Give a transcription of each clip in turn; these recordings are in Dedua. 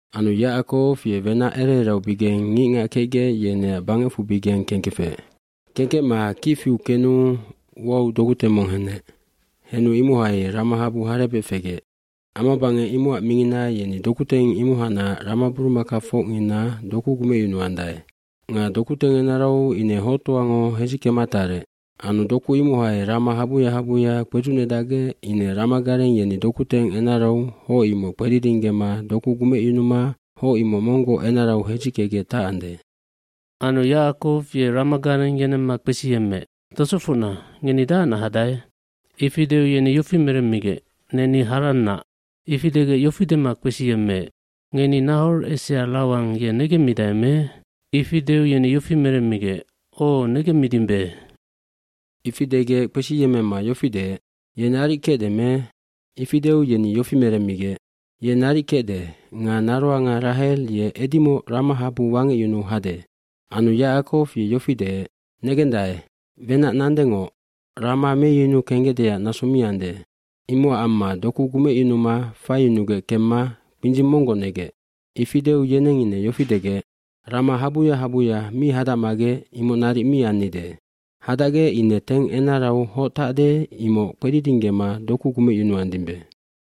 Anu Yacakow ye wenac ere ereaubigeng ngicngac kecgec yeneac bangecfubigeng kengkefec. aKengkecma kic fiu kenu uau dokuteng mong henec. Henu imohai ramahabu harebec fegec. Amabangec imocac mingina yeni dokuteng imohacnac ramaburumakafocngina doku gumecyunuandae. Nga dokuteng enarau ine hoctoango hedzickema tarec. Anu doku imohai rama habuya habuya kpedzucnedacgec ine ramagareng yeni dokuteng enarau hoc imoc kpedidinggema doku gumecyunuma hoc imoc monggoc enarau hedzickegec tacande. Anu Yacakow ye ramagareng yenemma kpesiyemmeec, “Tosofocna, ngeni dahacnac hadae?” Ifi deu yeni yofi meremmigec, “Neni Harannac.” bIfi degec yofi dema kpesiyemmeec, “Ngeni Nahor esea Lawan ye negemmidae me?” Ifi deu yeni yofi meremmigec, “O, negemmidimbe.” Ifi degec kpesiyemmema yofi deec, “Ye naric kecde me?” Ifi deu yeni yofi meremmigec, “Ye naric kecde nga naroanga Rahel ye edimoc ramahabu wangecyunu hade.” Anu Yacakow ye yofi deec, “Negendae, wenac nandengoc rama meyunu kenggecdeac naso mi ande. Imocac amma doku gumecyunuma faiyunugec kemma kpindzing monggoc negec.” Ifi deu yeneng ine yofi degec, “Rama habuya habuya mi hadacmagec imoc naric mi annide. Hadacgec ine teng enarau hoc tacde imoc kpedidinggema doku gumecyunuandimbe.”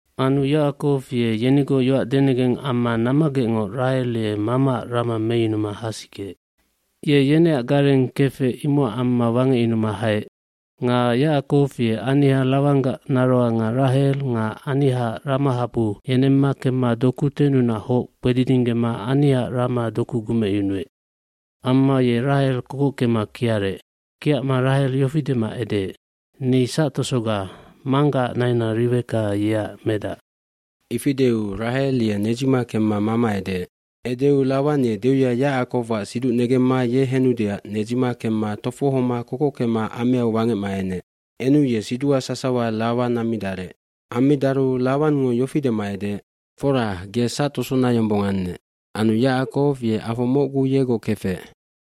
Anu Yacakow ye yenigoc yoac denegeng amma nammagecngoc Rahel ye mamaac rama meyunuma hasikeec. Ye yeneac gareng kefec imocac amma wangecyunuma haec. cNga Yacakow ye aniha Lawanggac naroanga Rahel nga anihaac ramahabu yenemma kemma dokutennunac hoc kpedidinggema anihaac rama doku gumecyunuec. Amma ye Rahel kokockema kiarec. Kiacma Rahel yofi dema edeec, “Ni sactosoga, manggaac naina Riweka yeac medac.” Ifi deu Rahel ye nedzima kemma mama edeec. Edeu Lawan ye deuya Yacakowac siduc negemma ye henudeac nedzima kemma tofohoma kokockema ameau wangecma enec. Enu ye siduha sasawa Lawan ammidarec. Ammidaru Lawangngo yofi dema edeec, “Fora, ge sactosona yombong annec.” Anu Yacakow ye afo mocgu yegoc kefec.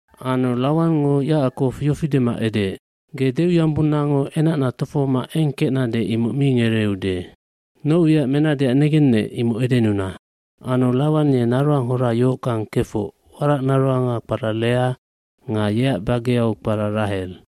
Anu Lawangngo Yacakow yofi dema edeec, “Ge deuyombonnango enacna tofohoma eng kecnade imoc mi ngereude. Noc wiac menadeac negennec imoc edenuna.” Anu Lawan ye naroanghora yohockang kefoc waracnaroanga kpara Lea nga yeac bageau kpara Rahel.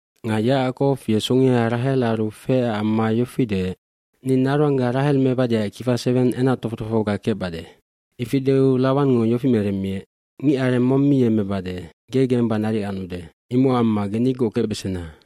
Nga Yacakow ye songea Rahelaru feecac amma yofi deec, “Ni naroangga Rahel mebadeac kifa seweng enactofoc tofohoga kecbade.” Ifi deu Lawangngo yofi meremmiec, “Ngicareng mong mi yemmebade. Ge gemba naric anude. Imocac amma ge nigoc kecbesena.”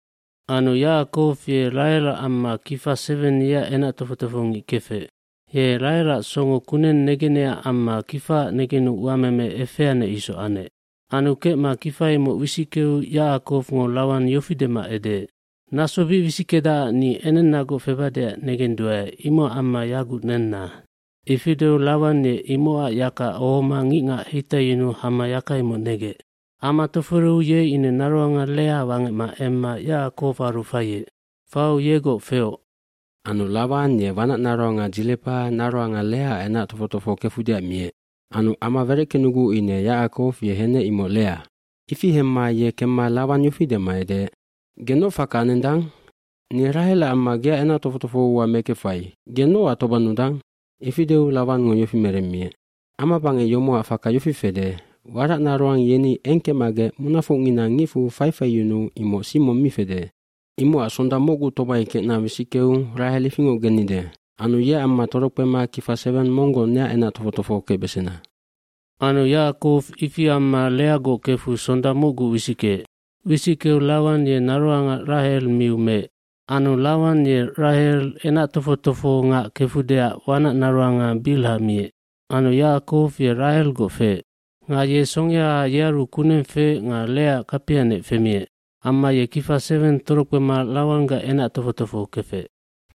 dAnu Yacakow ye Rahelac amma kifa seweng yeac enac tofoc tofohongic kefec. Ye Rahelac songo kuneng negenecac amma kifaac negenu uameme efeanec isoc anec. Anu kecma kifa imoc wisickeu Yacakowngo Lawan yofi dema edeec, “Naso bic wisickedacac ni enennagoc febadeac negenduae imocac amma yaguc nenna.” Ifi deu Lawan ye imocac yaka ohoma ngicngac heitaiyunuu hama yaka imoc negec. Ama toforeu ye ine naroanga Lea wangecma emma Yacakowaru faiec. Fau yegoc feoc. Anu Lawan ye wanacnaroanga Dzilepa naroanga Leaac enac tofoc tofoho kefudeac miec. Anu ama wereckenuguc ine Yacakow ye henec imoc Lea. Ifi hemma ye kemma Lawan yofi dema edeec, “Ge noc faka anendang? Ni Rahelac amma geac enac tofoc tofohoua mekefai. Ge nocac tobannudang?” Ifi deu Lawangngo yofi meremmiec, “Amabangec yomocac faka yofi fede waracnaroang yeni eng kecmagec munafocngina ngicfu faifaiyunu imoc sing mong mi fede. eImocac sonda mocgu tomai kecna wisickeu Rahel ifingoc gennide anu yeac amma torokpema kifa seweng monggoc neac enac tofoc tofoho kecbesena.” Anu Yacakow ifi amma Leagoc kefu sonda mocgu wisickeec. Wisickeu Lawan ye naroanga Rahel miu meec. Anu Lawan ye Rahel enac tofoc tofohongac kefudeac wanacnaroanga Bilha miec. Anu Yacakow ye Rahelgoc feec. Nga ye songea yearu kuneng feec nga Leaac kapianec femiec. Amma ye kifa seweng torokpema Lawanggac enac tofo tofoho kefec.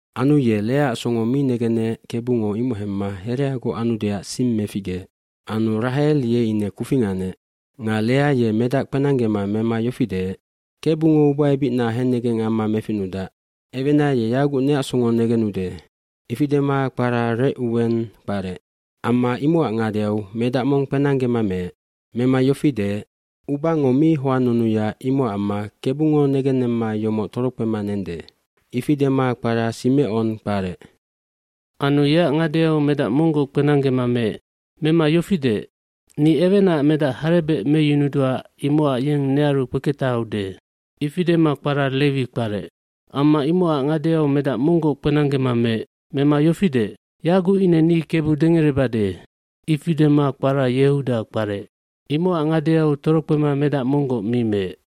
fAnu ye Leaac songo mi negenec Kebungo imoc hemmahereagoc anudeac sing meficgeec. Anu Rahel ye ine kufing anec. Nga Lea ye medac kpenanggema mema yofi deec, “Kebungo ubaebicna hennegeng amma meficnudac. Ewena ye yaguc neacsongo negenude.” Ifi dema kpara Recuweng kparec. Ammaimocac ngadeau medac mong kpenanggema meec. Mema yofi deec, “Ubango mi hoannunuya imocac amma Kebungo negennemmayomoc torokpema nende.” Ifi dema kpara Simecon w kparec. Anu yeac ngadeau medac monggoc kpenanggema meec. Mema yofideec, “Ni ewenaac medac harebec meyunudua imocac yeng nearukpeketahaude.” Ifi dema kpara Lewih kparec. Amma imocacngadeau medac monggoc kpenanggema meec. Mema yofi deec, “Yaguc ine ni Kebu dengerebade.” Ifi dema kpara Yehuda yi kparec. Imocac ngadeau torokpema medac monggoc mi meec.